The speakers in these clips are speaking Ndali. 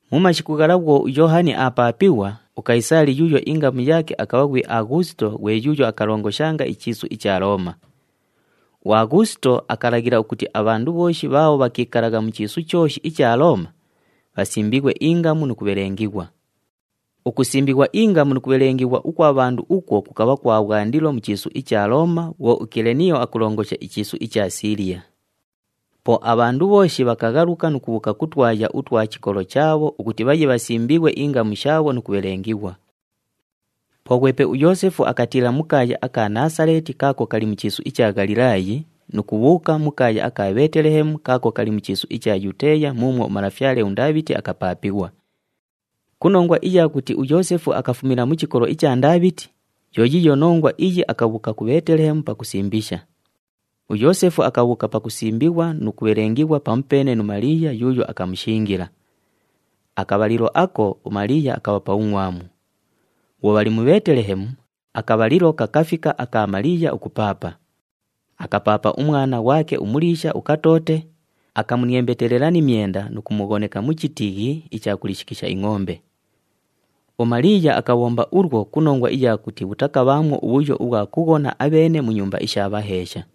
Mu mashiku ghala bhwo uYoohani aapaapighwa, uKayisaali yuuyo ingamu yaake akabha ghwi Aghuusito ghwe yuuyo akalongoshanga ichiisu icha Looma. UAghuusito akalaghila ukuti abhandu bhooshi bhaabho bhakiikalagha mu chiisu chooshi icha Looma, bhasimbighwe ingamu nu kubhabhelengighwa. Ukusimbighwa ingamu nu kubhelengighwa ukwa bhandu ukwo kukabha kwa bhwandilo mu chiisu icha Looma bhwo uKileniyo akulongosha ichiisu icha Siiliya. Po abhandu bhooshi bhakaghaluka nu kubhuuka ku twaya utwa chikolo chaabho ukuti bhaye bhasimbighwe ingamu shaabho nu kubhelengighwa. Po ghwepe uYoosefu akatiila mu kaaya aka Naasaleeti kaako kali mu chiisu icha Ghalilaayi nu kubhuuka mu kaaya aka Bheetelehemu kaako kali mu chiisu icha Yuteeya muumwo umalafyale uNdaabhiti akapaapighwa. Ku nongwa iya kuti uYoosefu akafumila mu chikolo icha Ndaabhiti, yo yiiyo nongwa iyi akabhuuka ku Bheetelehemu pakusimbisha. UYoosefu akabhuuka pakusimbighwa nu kubhelengighwa pamupeene nu Maliiya yuuyo akamushingila. Akabhalilo ako, uMaliiya akabha pa bhungʼwamu. Bhwo bhali mu Bheetelehemu, akabhalilo kakafika aka Maliiya ukupaapa. Akapaapa umwana ghwake umuliisha, ukatoote, akamuniembetelela ni myenda nu kumughoneka mu chitiighi icha kuliishikisha ingʼombe. UMaliiya akabhomba ulwo ku nongwa iya kuti bhutakabhaamwo ubhuyo ubhwa kughona abheene mu nyumba isha bhaheesha.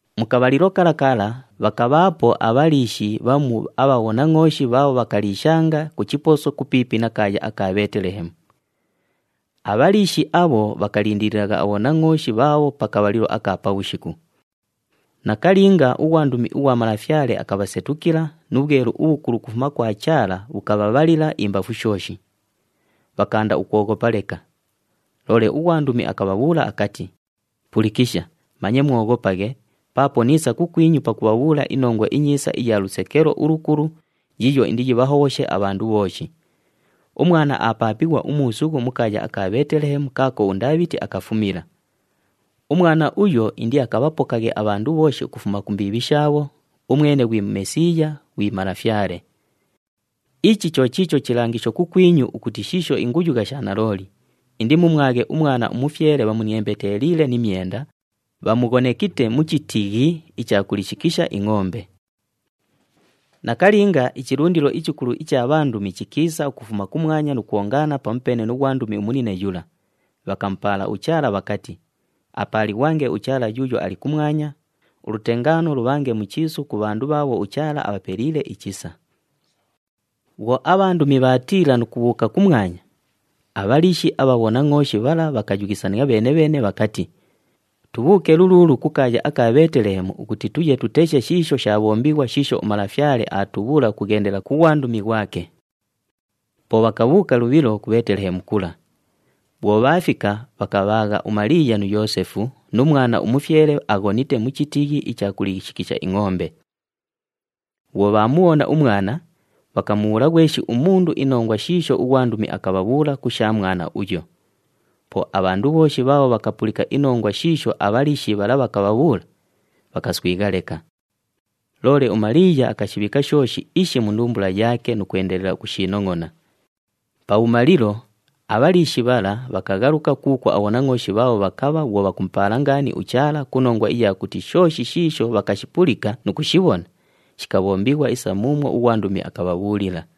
Mu kabhalilo kala kala, bhakabhaapo abhaliishi bhamu abha bhonangʼooshi bhaabho bhakaliishanga ku chiposo kupiipi na kaaya aka Bheetelehemu. Abhaliishi abho bhakalindililagha abhonangʼooshi bhaabho pa kabhalilo aka pabhushiku. Nakalinga, ughwandumi ughwa Malafyale akabhasetukila nu bhwelu ubhukulu ukufuma kwa Chaala bhukabhabhalila imbafu shooshi. Bhakaanda ukwoghopa leka. Loole ughwandumi akabhabhuula akati, “Pulikisha, manye mwoghopaghe, paapo niisa kukwinyu pakubhabhuula inongwa inyiisa iya lusekelo ulukulu yiiyo indiyibhahobhoshe abhandu bhooshi. Umwana aapaapighwa umuusughu mu kaaya aka Bheetelehemu kaako uNdaabhiti akafumila. Umwana uyo indiakabhapokaghe abhandu bhooshi ukufuma ku mbiibhi shaabho, umwene ghwi Mesiiya, ghwi Malafyale. Ichi cho chiicho chilangisho kukwinyu ukuti shiisho inguyugha sha nalooli, indimumwaghe umwana umufyele bhamuniembeteliile ni myenda, bhamughonekite mu chitiighi icha kuliishikisha ingʼombe.” Nakalinga, ichilundilo ichikulu icha bhandumi chikiisa ukufuma kumwanya nu kwongaana pamupeene nu ghwandumi umunine yula, bhakamupaala uChaala bhakati, “Apaalighwange uChaala yuuyo ali kumwanya, ulutengaano lubhange mu chiisu ku bhandu bhaabho uChaala abhapeliile ichisa.” Bhwo abhandumi bhaatiila nu kubhuuka kumwanya, abhaliishi abha bhonangʼooshi bhala bhakayughisania bheene-bheene bhakati, “Tubhuuke luluulu ku kaaya aka Bheetelehemu ukuti tuye tuteshe shiisho shaabhombighwa shiisho uMalafyale aatubhuula ukughendela ku ghwandumi ghwake.” Po bhakabhuuka lubhilo ku Bheetelehemu kula. Bhwo bhaafika, bhakabhaagha uMaliiya nu Yoosefu, nu mwana umufyele aghonite mu chitiighi icha kuliishikisha ingʼombe. Bhwo bhaamubhona umwana, bhakamubhuula ghweshi umundu inongwa shiisho ughwandumi akabhabhuula ku sha mwana uyo. Po abhandu bhooshi bhaabho bhakapulika inongwa shiisho abhaliishi bhala bhakabhabhuula, bhakaswigha leka. Loole uMaliiya akashibhiika shooshi ishi mu ndumbula yaake nu kwendelela ukushiinongʼona. Pabhumalilo, abhaliishi bhala bhakaghaluka kuukwo abhonangʼooshi bhaabho bhakabha bhwo bhakumupaala ngaani uChaala ku nongwa iya kuti shooshi shiisho bhakashipulika nu kushibhona, shikabhombighwa isa muumwo ughwandumi akabhabhuulila.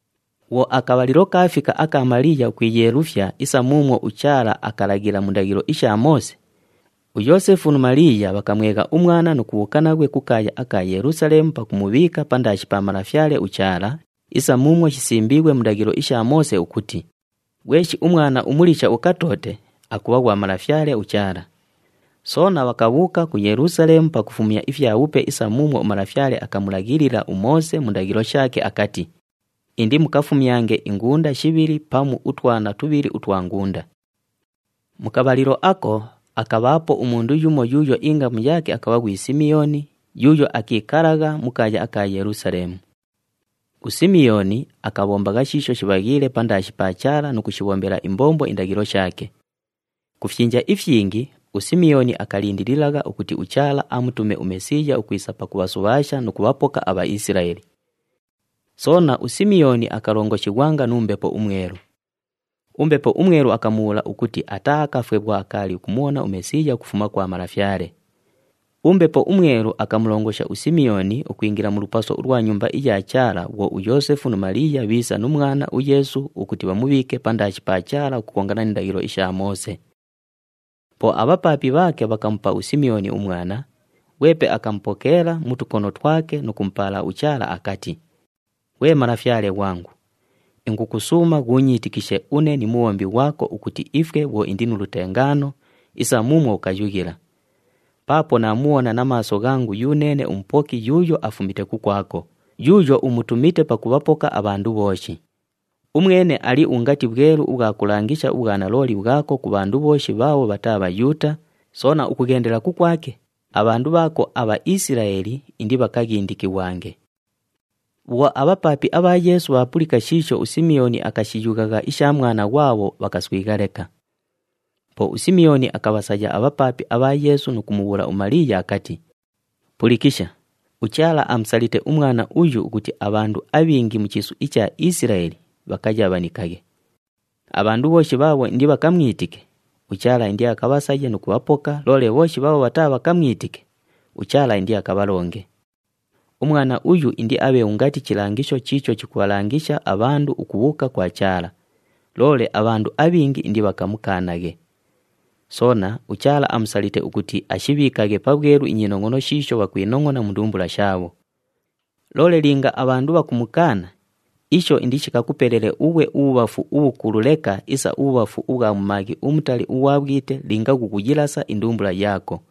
Bhwo akabhalilo kaafika aka Maliiya ukwiyeelufya isa muumwo uChaala akalaghila mu ndaghilo isha Moose, uYoosefu nu Maliiya bhakamwegha umwana nu kubhuuka naghwe ku kaaya aka Yelusaleemu pakumubhiika pandaashi pa Malafyale uChaala isa muumwo shisimbiighwe mu ndaghilo isha Moose ukuti, “Ghweshi umwana umuliisha ukatoote, akubha ghwa Malafyale uChaala.” Soona bhakabhuuka ku Yelusaleemu pakufumya ifyabhupe isa muumwo uMalafyale akamulaghilila uMoose mu ndaghilo shaake akati, “Indimukafumyange ingunda shibhili pamu utwana tubhili utwa ngunda.” Mu kabhalilo ako, akabhaapo umundu yumo yuuyo ingamu yaake akabha ghwi Simiyooni yuuyo akiikalagha mu kaaya aka Yelusaleemu. USimiyooni akabhombagha shiisho shibhaghiile pandaashi pa Chaala nu kushibhombela imbombo indaghilo shaake. Ku fyinja ifyingi, uSimiyooni akalindililagha ukuti uChaala amutume uMesiiya ukwisa pakubhasubhaasha nu kubhapoka aBhaisilaeli. Soona, uSimiyooni akalongoshighwanga nu Mbepo uMwelu. UMbepo uMwelu akamubhuula ukuti ataaakafwe bhwo akaali ukumubhona uMesiiya ukufuma kwa Malafyale. UMbepo uMwelu akamulongosha uSimiyooni ukwingila mu lupaso ulwa Nyumba iya Chaala bhwo uYoosefu nu Maliiya bhiisa nu mwana uYeesu ukuti bhamubhiike pandaashi pa Chaala ukukongana ni ndaghilo isha Moose. Po abhapaapi bhaake bhakamupa uSimiyooni umwana, ghwepe akamupokeela mu tukono twake nu kumupaala uChaala akati, “Ghwe Malafyale ghwangu, ingukusuuma ghuunyiitikishe une ni mubhombi ghwako ukuti ifwe bhwo indi nu lutengaano, isa muumwo ukayughila. Paapo naamubhona na maaso ghangu yuneene uMupoki yuuyo afumite kukwako, yuuyo umutumite pakubhapoka abhandu bhooshi. Umwene ali ungati bhwelu ubhwa kulangisha ubhwanalooli bhwako ku bhandu bhooshi bhaabho bhataa Bhayuuta, soona ukughendela kukwake, abhandu bhaako aBhaisilaeli indibhaghindikighwange.” Bhwo abhapaapi abha Yeesu bhaapulika shiisho uSimiyooni akashiyughagha isha mwana ghwabho, bhakaswigha leka. Po uSimiyooni akabhasaya abhapaapi abha Yeesu nu kumubhuula uMaliiya akati, “Pulikisha, uChaala amusalite umwana uyu ukuti abhandu abhingi mu chiisu icha Isilaeli bhakayabhanikaghe. Abhandu bhooshi bhaabho indibhakamwitike, uChaala indiakabhasaye nu kubhapoka, loole bhooshi bhaabho bhataabhakamwitike, uChaala indiakabhalonge. Umwana uyu indiabhe ungati chilangisho chiicho chikubhalangisha abhandu ukubhuuka kwa Chaala, loole abhandu abhingi indibhakamukaanaghe. Soona, uChaala amusalite ukuti ashibhiikaghe pabhwelu inyinongʼono shiisho bhakwinongʼona mu ndumbula shaabho. Loole linga abhandu bhakumukaana, isho indishikakupelele ughwe ubhubhafu ubhukulu leka isa ubhubhafu ubhwa mumaaghi umutali ughwa bhwite linga ghukuyilasa indumbula yaako.”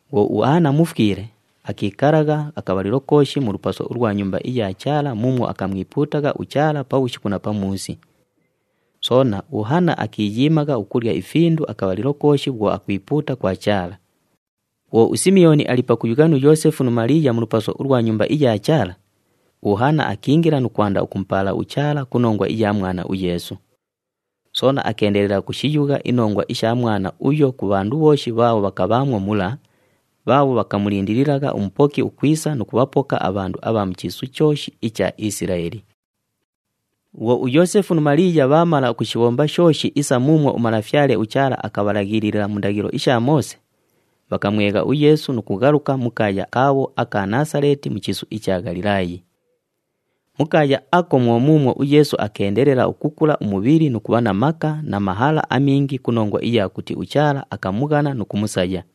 Bhwo uHana mufwile, akiikalagha akabhalilo kooshi mu lupaso ulwa Nyumba iya Chaala muumwo akamwipuutagha uChaala pabhushiku na pamuusi. Soona, uHana akiiyiimagha ukulya ifindu akabhalilo kooshi bhwo akwipuuta kwa Chaala. Bhwo uSimiyooni ali pakuyugha nu Yoosefu nu Maliiya mu lupaso ulwa Nyumba iya Chaala, uHana akiingila nu kwanda ukumupaala uChaala ku nongwa iya mwana uYeesu. Soona akeendelela ukushiyugha inongwa isha mwana uyo ku bhandu bhooshi bhaabho bhakabhaamwo mula, bhaabho bhakamulindililagha uMupoki ukwisa nu kubhapoka abhandu abha mu chiisu chooshi icha Isilaeli. Bhwo uYoosefu nu Maliiya bhaamala ukushibhomba shooshi isa muumwo uMalafyale uChaala akabhalaghilila mu ndaghilo isha Moose, bhakamwegha uYeesu nu kughaluka mu kaaya kaabho aka Naasaleeti mu chiisu icha Ghalilaayi. Mu kaaya ako mwo muumwo uYeesu akeendelela ukukula umubhili nu kubha na maka na mahala amingi ku nongwa iya kuti uChaala akamughana nu kumusaya.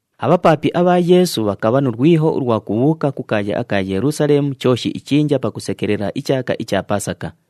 Abhapaapi abha Yeesu bhakabha nu lwiho ulwa kubhuuka ku kaaya aka Yelusaleemu chooshi ichinja pakusekelela ichaaka icha Pasaka.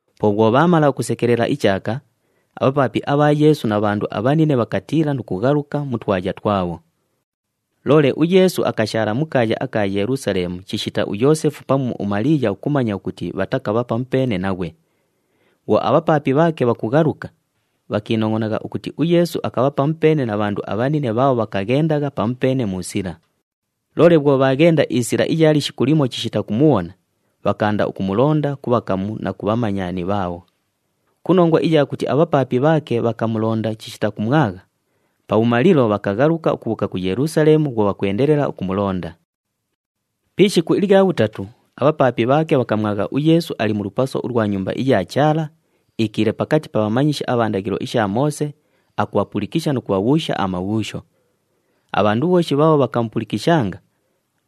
Po bhwo bhaamala ukusekelela ichaaka, abhapaapi abha Yeesu na bhandu abhanine bhakatiila nu kughaluka mu twaya twabho. Loole uYeesu akashaala mu kaaya aka Yelusaleemu chishita Yoosefu pamu uMaliiya ukumanya ukuti bhatakabha pamupeene naghwe. Bhwo abhapaapi bhaake bhakughaluka, bhakiinongʼonagha ukuti uYeesu akabha pamupeene na bhandu abhanine bhaabho bhakaghendagha pamupeene mu sila. Loole bhwo bhaaghenda isila iya lishiku limo chishita kumubhona, bhakaanda ukumulonda ku bhakamu na ku bhamanyani bhaabho. Ku nongwa iya kuti abhapaapi bhaake bhakamulonda chishita kumwagha, pabhumalilo bhakaghaluka ukubhuuka ku Yelusaleemu bhwo bhakwendelela ukumulonda. Pi ishiku ilya bhutatu, abhapaapi bhaake bhakamwagha uYeesu ali mu lupaso ulwa Nyumba iya Chaala, iikiile pakati pa bhamanyishi abha ndaghilo isha Moose, akubhapulikisha nu kubhabhuusha amabhuusho. Abhandu bhooshi bhaabho bhakamupulikishanga,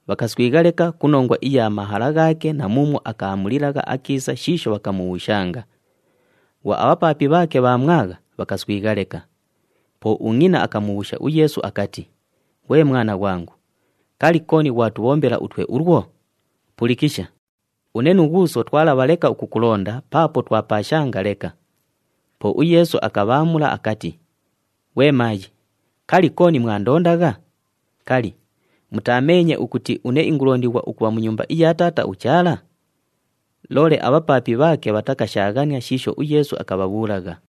bhakaswigha leka ku nongwa iya mahala ghaake na muumwo akaamulilagha akiisa shiisho bhakamubhuushanga. Bhwo abhapaapi bhaake bhaamwagha, bhakaswigha leka. Po ungʼina akamubhuusha uYeesu akati, “Ghwe mwana ghwangu, kali, kooni ghwatubhombela utwe ulwo? Pulikisha, une nu ghuuso twalabha leka ukukulonda paapo twapaashanga leka.” Po uYeesu akabhaamula akati, “Ghwe maayi, kali, kooni mwandondagha? Kali, mutaameenye ukuti une ingulondighwa ukubha mu nyumba iya Taata uChaala?” Loole abhapaapi bhaake bhatakashaaghania shiisho uYeesu akabhabhuulagha.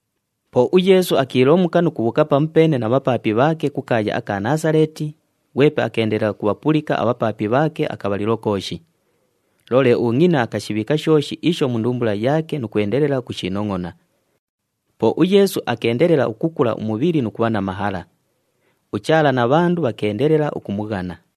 Po uYeesu akiilomuka nu kubhuuka pamupeene na bhapaapi bhaake ku kaaya aka Naasaleeti, ghwepe akeendelela ukubhapulika abhapaapi bhaake akabhalilo kooshi. Loole ungʼina akashibhiika shooshi isho mu ndumbula yaake nu kwendelela ukushiinongʼona. Po uYeesu akeendelela ukukula umubhili nu kubha na mahala. UChaala na bhandu bhakeendelela ukumughana.